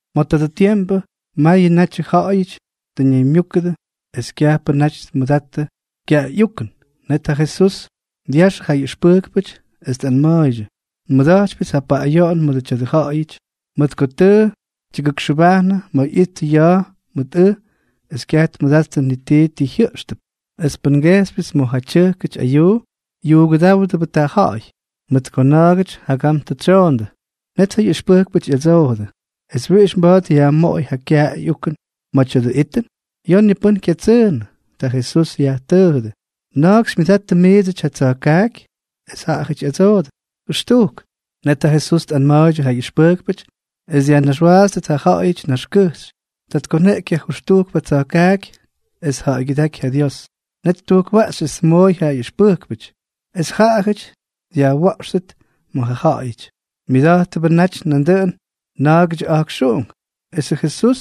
Ma̱ tadʉ tiempʉ mayʉ natyʉ ja̱ꞌa̱yʉty tʉ ñaymyúkʉdʉ es kyajpʉ naty tmʉdattʉ kyaꞌay ꞌyukʉn. Net ja Jesús dyaxʉ ja ꞌyʉxpʉjkpʉty es tꞌanma̱a̱ydyʉ: —Nmʉda̱jtypyʉts ja paꞌꞌayoꞌon mʉdʉ tya̱dʉ ja̱ꞌa̱yʉty, mʉt ko tʉ tyʉgʉkxʉbajnʉ ma̱ ꞌyittʉ ya̱a̱ mʉt ʉj es kyaj tmʉdattʉ ni tii ti jyʉꞌxtʉp. Es pʉn ngejxypyʉts ma̱ ja tyʉjkʉty ayuu, yuugʉdáwdʉbʉꞌʉ tuꞌa̱a̱y, mʉt ko na̱a̱gʉty jagam tʉ tsyoondʉ. Net ja ꞌyʉxpʉjkpʉty ꞌyadsoojʉdʉ: —¿Es wiꞌix mba̱a̱t yajmoꞌoy ja kyaꞌay ꞌyukʉn ma̱ tya̱dʉ itʉn? Ya̱a̱ ni pʉ́n kyatsʉʉnʉ. Ta Jesús yajtʉʉjʉdʉ: —¿Na̱a̱k xymyʉdattʉ miidsʉty yʉ tsa̱jkaaky? Es jaꞌajʉty ꞌyadsoodʉ: —Jʉxtujk. Net ja Jesús tꞌanma̱a̱ydyʉ ja ꞌyʉxpʉjkpʉty es dyajnaxwaatstʉt ja ja̱ꞌa̱yʉty naxkʉjxy. Ta tkoneꞌky ja jʉxtujkpʉ tsa̱jkaaky es tja̱ꞌa̱ygyʉdáky ja Dios. Net ttujkwaꞌxy es tmooy ja ꞌyʉxpʉjkpʉty, es jaꞌajʉty dyajwa̱ꞌxtʉt ma̱ ja ja̱ꞌa̱yʉty. Myʉda̱jttʉbʉ naty nandʉꞌʉn na̱a̱gʉdyʉ a̱jkxuꞌunk. Esʉ Jesús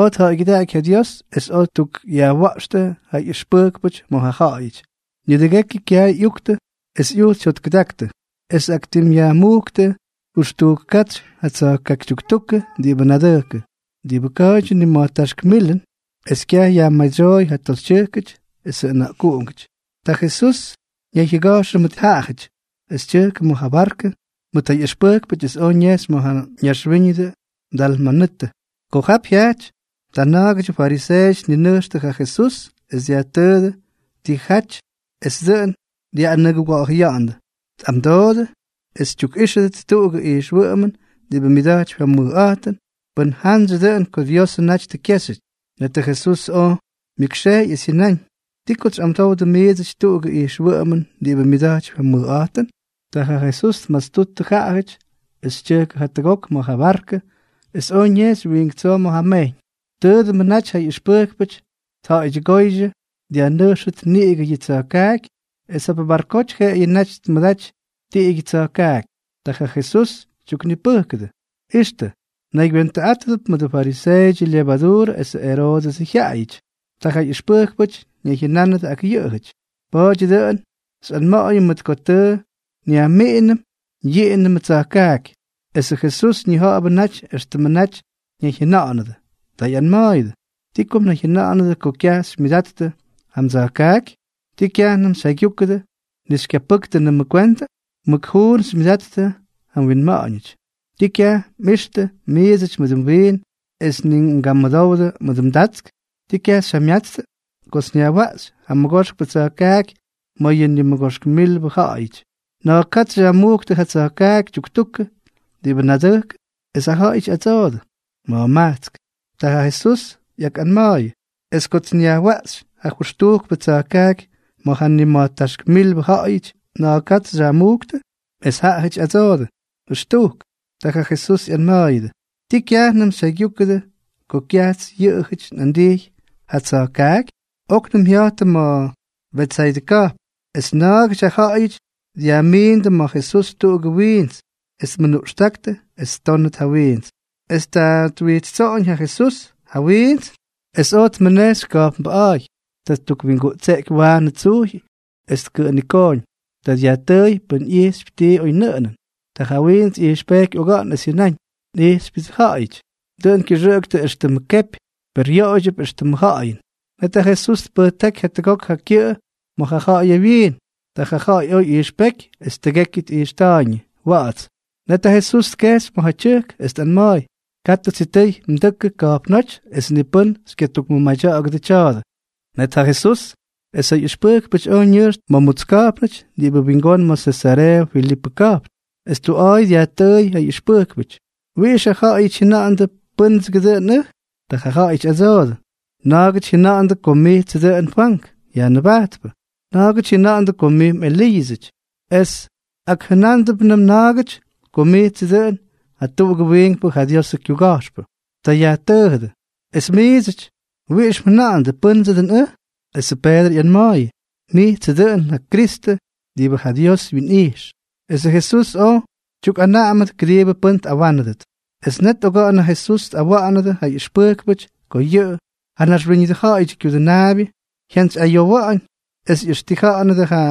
oj tja̱ꞌa̱ygyʉdaꞌaky ja Dios, es oj ttukꞌyajwa̱ꞌxtʉ ja ꞌyʉxpʉjkpʉty ma̱ ja ja̱ꞌa̱yʉty. Nidʉgekyʉ kyaay ꞌyuktʉ es ꞌyujts jyotkʉdaktʉ, es tꞌaktimꞌyajmujktʉ jʉxtujk katsy ja tsa̱jkaaky tyuktukʉ diꞌibʉ nadʉjkʉ. Diꞌibʉ ka̱a̱ydyʉ nima̱jtáxk milʉn, es kyaj yajmaydsyóy ja toxytyʉjkʉty esʉ ʉna̱ꞌkuꞌungʉty. Ta Jesús ñayjyʉga̱jxʉ mʉt jaꞌajʉty, es tyʉjkʉ ma̱ ja barkʉ mʉt ja ꞌyʉxpʉjkpʉty es oj ñejxy ma̱ ja ñaxwíñʉdʉ Dalmanutʉ. Ko jap jyajty, ta na̱a̱gʉdyʉ fariseeʉty tninʉjxtʉ ja Jesús es dyajtʉʉdʉ tijaty es dʉꞌʉn dyaꞌꞌanʉguga̱ꞌa̱jʉya̱ꞌa̱ndʉ. Ta tꞌamdoodʉ es tyukꞌíxʉdʉt tuꞌugʉ ijxwʉꞌʉmʉn diꞌibʉ myʉda̱jtypy ja mʉjꞌa̱jtʉn pʉn jantsyʉ dʉꞌʉn ko Diosʉ naty tʉ kyéxyʉty. Netʉ Jesús oj myʉkxejy es jyʉnáñ: —¿Ti kots xyꞌamdowdʉ miidsʉty tuꞌugʉ ijxwʉꞌʉmʉn diꞌibʉ myʉda̱jtypy ja mʉjꞌa̱jtʉn? Ta ja Jesús tmastuttʉ jaꞌajʉty, es tyʉjkʉ jatʉgok ma̱ ja barkʉ es oj ñejxy wiink tsoo ma̱ ja mejyñ. Tʉʉdʉmʉ naty ja ꞌyʉxpʉjkpʉty tja̱ꞌa̱ydyʉgóydyʉ dyajnʉjxʉt niꞌigʉ yʉ tsa̱jkaaky, es jap barkoty jeꞌeyʉ naty tmʉdaty tiꞌigyʉ tsya̱jkaaky. Ta ja Jesús tyuknipʉjkʉdʉ: —Ixtʉ, mnaygywentʉꞌátʉdʉp mʉdʉ fariseeʉdyʉ lyevaduurʉ esʉ Eroodʉsʉ jyaꞌajʉty. Ta ja ꞌyʉxpʉjkpʉty ñayjyʉnánʉdʉ ak yʉꞌʉjʉty: —Pa̱a̱dyʉ dʉꞌʉn xyꞌanma̱ꞌa̱yʉm mʉt ko tʉ nyajmiꞌinʉm yiꞌinʉm tsa̱jkaaky. Esʉ Jesús ñija̱ꞌa̱bʉ naty éxtʉmʉ naty ñayjyʉna̱ꞌa̱nʉdʉ. Ta ꞌyanma̱a̱yʉdʉ: —¿Ti ko mnayjyʉna̱ꞌa̱nʉdʉ ko kyaj xymyʉdattʉ ja mdsa̱jkaaky? ¿Tii kyajnʉm xyjaygyúkʉdʉ es ni xykyapʉ́ktʉnʉmʉ kwentʉ? Mʉk juun xymyʉdattʉ ja mwinma̱ꞌa̱ñʉty. ¿Tii kyaj mꞌixtʉ miidsʉty mʉdʉ mwiin, es ni mgamʉdowdʉ mʉdʉ mdatsk? ¿Ti kyaj xyjamyatstʉ? Kots nyajwaꞌxy ja mʉgoxkpʉ tsa̱jkaaky ma̱ yʉ nimʉgoxk milbʉ ja̱ꞌa̱yʉty, ¿na̱a̱k katsy xyajmujktʉ ja tsa̱jkaaky tyuktukʉ diꞌibʉ nadʉjkʉ? Es jaꞌajʉty ꞌyadsoodʉ: —Ma̱jmajtsk. Ta ja Jesús ꞌyakꞌanma̱a̱yʉdʉ: —Es kots nyajwaꞌxy ja jʉxtujkpʉ tsa̱jkaaky ma̱ ja nima̱jtáxk milbʉ ja̱ꞌa̱yʉty, ¿na̱a̱k katsy xyajmujktʉ? Es jaꞌajʉty ꞌyadsoodʉ: —Jʉxtujk. Ta ja Jesús ꞌyanma̱a̱yʉdʉ: —¿Tii kyajnʉm xyjaygyúkʉdʉ ko kyajts yʉꞌʉjʉty nꞌandijy ja tsa̱jkaaky? Oknʉm jya̱jttʉ ma̱ Betsaydʉ ka̱jpn, es na̱a̱gʉty ja ja̱ꞌa̱yʉty dyajmiindʉ ma̱ Jesús tuꞌugʉ wiints, es tmʉnuꞌxtáktʉ es ttónʉt ja wiints. Es ta twijtstsoꞌoñ ja Jesús ja wiints es oj tmʉnejxy ka̱jpnbʉꞌa̱a̱y. Ta ttukwinguꞌtseꞌky waanʉ tsujy es tkʉꞌʉnikooñ. Ta dyajtʉʉy pʉn ꞌyijxypy tii oynʉꞌʉnʉn. Ta ja wiints ꞌyijxpejky oga̱ꞌa̱n, es jyʉnáñ: —Nꞌijxypyʉdsʉ ja̱ꞌa̱yʉty. Dʉꞌʉn kyʉxʉꞌʉktʉ éxtʉmʉ kepy, per yoꞌoydyʉp éxtʉmʉ ja̱ꞌa̱yʉn. Net ja Jesús tpʉjtáky jatʉgok ja kyʉꞌʉ ma̱ ja ja̱ꞌa̱yʉ wyiin. Ta ja ja̱ꞌa̱y oj ꞌyijxpéky es tʉgekyʉ tꞌijxta̱a̱yñʉ wa̱ꞌa̱ts. Net ja Jesús tkejxy ma̱ ja tyʉjk, es tꞌanma̱a̱y: —Katʉ sitʉy mdʉkʉ ka̱jpnóty es ni pʉ́n xykyatukmʉmadya̱ꞌa̱gʉdʉ tya̱a̱dʉ. Net ja Jesús es ja ꞌyʉxpʉjkpʉty oj ñʉjxtʉ ma̱ mutsk ka̱jpnʉty diꞌibʉ wingón ma̱ Sesareeʉ Filipʉ ka̱jpn. Es tuꞌa̱a̱y dyajtʉʉy ja ꞌyʉxpʉjkpʉty: —¿Wiꞌix ja ja̱ꞌa̱yʉty jyʉna̱ꞌa̱ndʉ pʉ́ndsʉgʉ dʉn ʉj? Ta jaꞌajʉty ꞌyadsoodʉ: —Na̱a̱gʉty jyʉna̱ꞌa̱ndʉ ko mijtsʉ dʉꞌʉn Fwank Yajnʉbajtpʉ, na̱a̱gʉty jyʉna̱ꞌa̱ndʉ ko mij mꞌEliiʉsʉty, es akjʉnándʉpnʉm na̱a̱gʉty ko mijtsʉ dʉꞌʉn jatuꞌugʉ wiinkpʉ ja Diosʉ kyuga̱jxpʉ. Ta yajtʉʉjʉdʉ: —Es miidsʉty, ¿wiꞌix mjʉna̱ꞌa̱ndʉ, pʉ́ndsʉ dʉn ʉj? Esʉ Peedrʉ ꞌyanma̱a̱yʉ: —Mijtsʉ dʉꞌʉn ja Kristʉ diꞌibʉ ja Dios wyinꞌijx. Esʉ Jesús oj tyukꞌanaꞌamʉdʉ kʉdiibʉ pʉ́n tꞌawánʉdʉt. Es net oga̱ꞌa̱n ja Jesús tꞌawa̱ꞌa̱nʉdʉ ja ꞌyʉxpʉjkpʉty ko yʉꞌʉ, ja Naxwíñʉdʉ Ja̱ꞌa̱yʉdyʉ Kyudʉnaabyʉ, jyantsyꞌayowa̱ꞌa̱ñ, es ꞌyʉxtija̱ꞌa̱nʉdʉ ja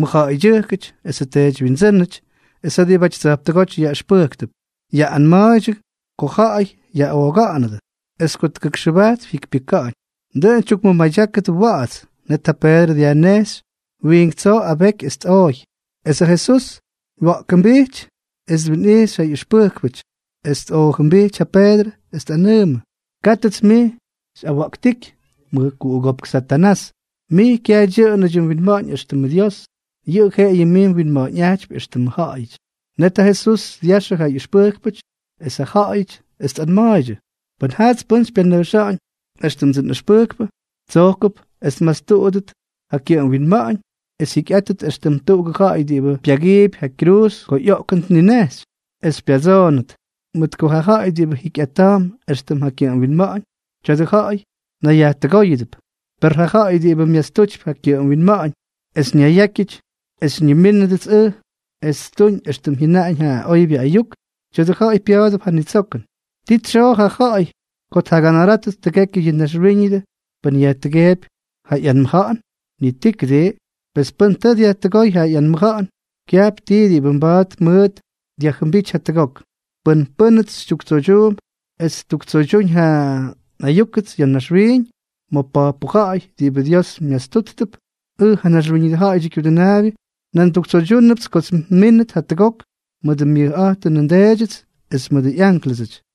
mʉjja̱ꞌa̱ydyʉjkʉty esʉ teedywyindsʉ́nʉty es ja diꞌibʉty tsa̱jptʉgóty yaꞌʉxpʉjktʉp, ꞌyaꞌꞌanma̱a̱ydyʉ ko ja̱ꞌa̱y yaꞌooga̱ꞌa̱nʉdʉ, es ko tʉgʉkxʉbajtp jyikypyʉka̱ꞌa̱ñ. Dʉꞌʉn tyukmʉmadyákʉdʉ wa̱ꞌa̱ts. Net ja Peedrʉ dyajnejxy wiink tsoo abeky es tꞌooy. Es ja Jesús wya̱ꞌkʉmbijty, es twinꞌijxy ja ꞌyʉxpʉjkpʉty es tꞌoojʉmbijty ja Peedrʉ, es tꞌanʉʉmʉ: —¡Kátʉts mij xyꞌawa̱ꞌktíky, mʉjkuꞌugópk Satanás! Mij kyaj dyʉꞌʉnʉdyʉ mwinma̱ꞌa̱ñ éxtʉmʉ Dios, yʉꞌʉ jeꞌeyʉ mij mwinma̱ꞌa̱ñꞌajtypy éxtʉmʉ ja̱ꞌa̱yʉty. Net ja Jesús dyaxʉ ja ꞌyʉxpʉjkpʉty es ja ja̱ꞌa̱yʉty, es tꞌanma̱a̱ydyʉ: —Pʉn jaats pʉ́n xypyanʉjxa̱ꞌa̱ñ éxtʉmdsʉ nꞌʉxpʉjkpʉ, tsojkʉp es tmastuꞌudʉt ja kyʉꞌʉm winma̱ꞌa̱ñ es jyikyꞌátʉt éxtʉm tuꞌugʉ ja̱ꞌa̱y diꞌibʉ pyagiipy ja kyruuz ko ꞌyoꞌkʉn tninejxy, esʉts xypyatsoonʉt. Mʉt ko ja ja̱ꞌa̱y diꞌibʉ jikyꞌata̱a̱mp éxtʉm ja kyʉꞌʉm winma̱ꞌa̱ñ, tya̱dʉ ja̱ꞌa̱y nayyajtʉgóyʉdʉp. Per ja ja̱ꞌa̱y diꞌibʉ myastutypy ja kyʉꞌʉm winma̱ꞌa̱ñ es ñayyákyʉty es xymyʉdúñʉts ʉj es ttuñ éxtʉm jyʉnaꞌañ ja oybyʉ ayuk, tya̱dʉ ja̱ꞌa̱y pya̱a̱dʉp ja nitsokʉn. ¿Ti tsyoo ja ja̱ꞌa̱y ko tjaganarátʉt tʉgekyʉ yʉ naxwíñʉdʉ pʉn yajtʉgeepy ja ꞌyanmʉja̱ꞌa̱n? Ni tii, ¿kʉdii? Pes pʉn tʉ dyajtʉgóy ja ꞌyanmʉja̱ꞌa̱n, kyajp tii diꞌibʉ mba̱a̱t mʉʉt dyajjʉmbíty jatʉgok. ’Pʉn pʉ́nʉts xytyuktsoydyuump es ttuktsoydyúñ ja nꞌayúkʉts ya̱ naxwiiñ ma̱ pojpʉ ja̱ꞌa̱y diꞌibʉ Dios myastúttʉp, ʉj, ja Naxwíñʉdʉ Ja̱ꞌa̱yʉdyʉ Kyudʉnaabyʉ, nan nduktsoydyúnʉpts kots nmínʉt jatʉgok mʉdʉ myʉjꞌa̱jtʉnʉ nDeedyʉts es mʉdʉ ꞌyánklʉsʉty.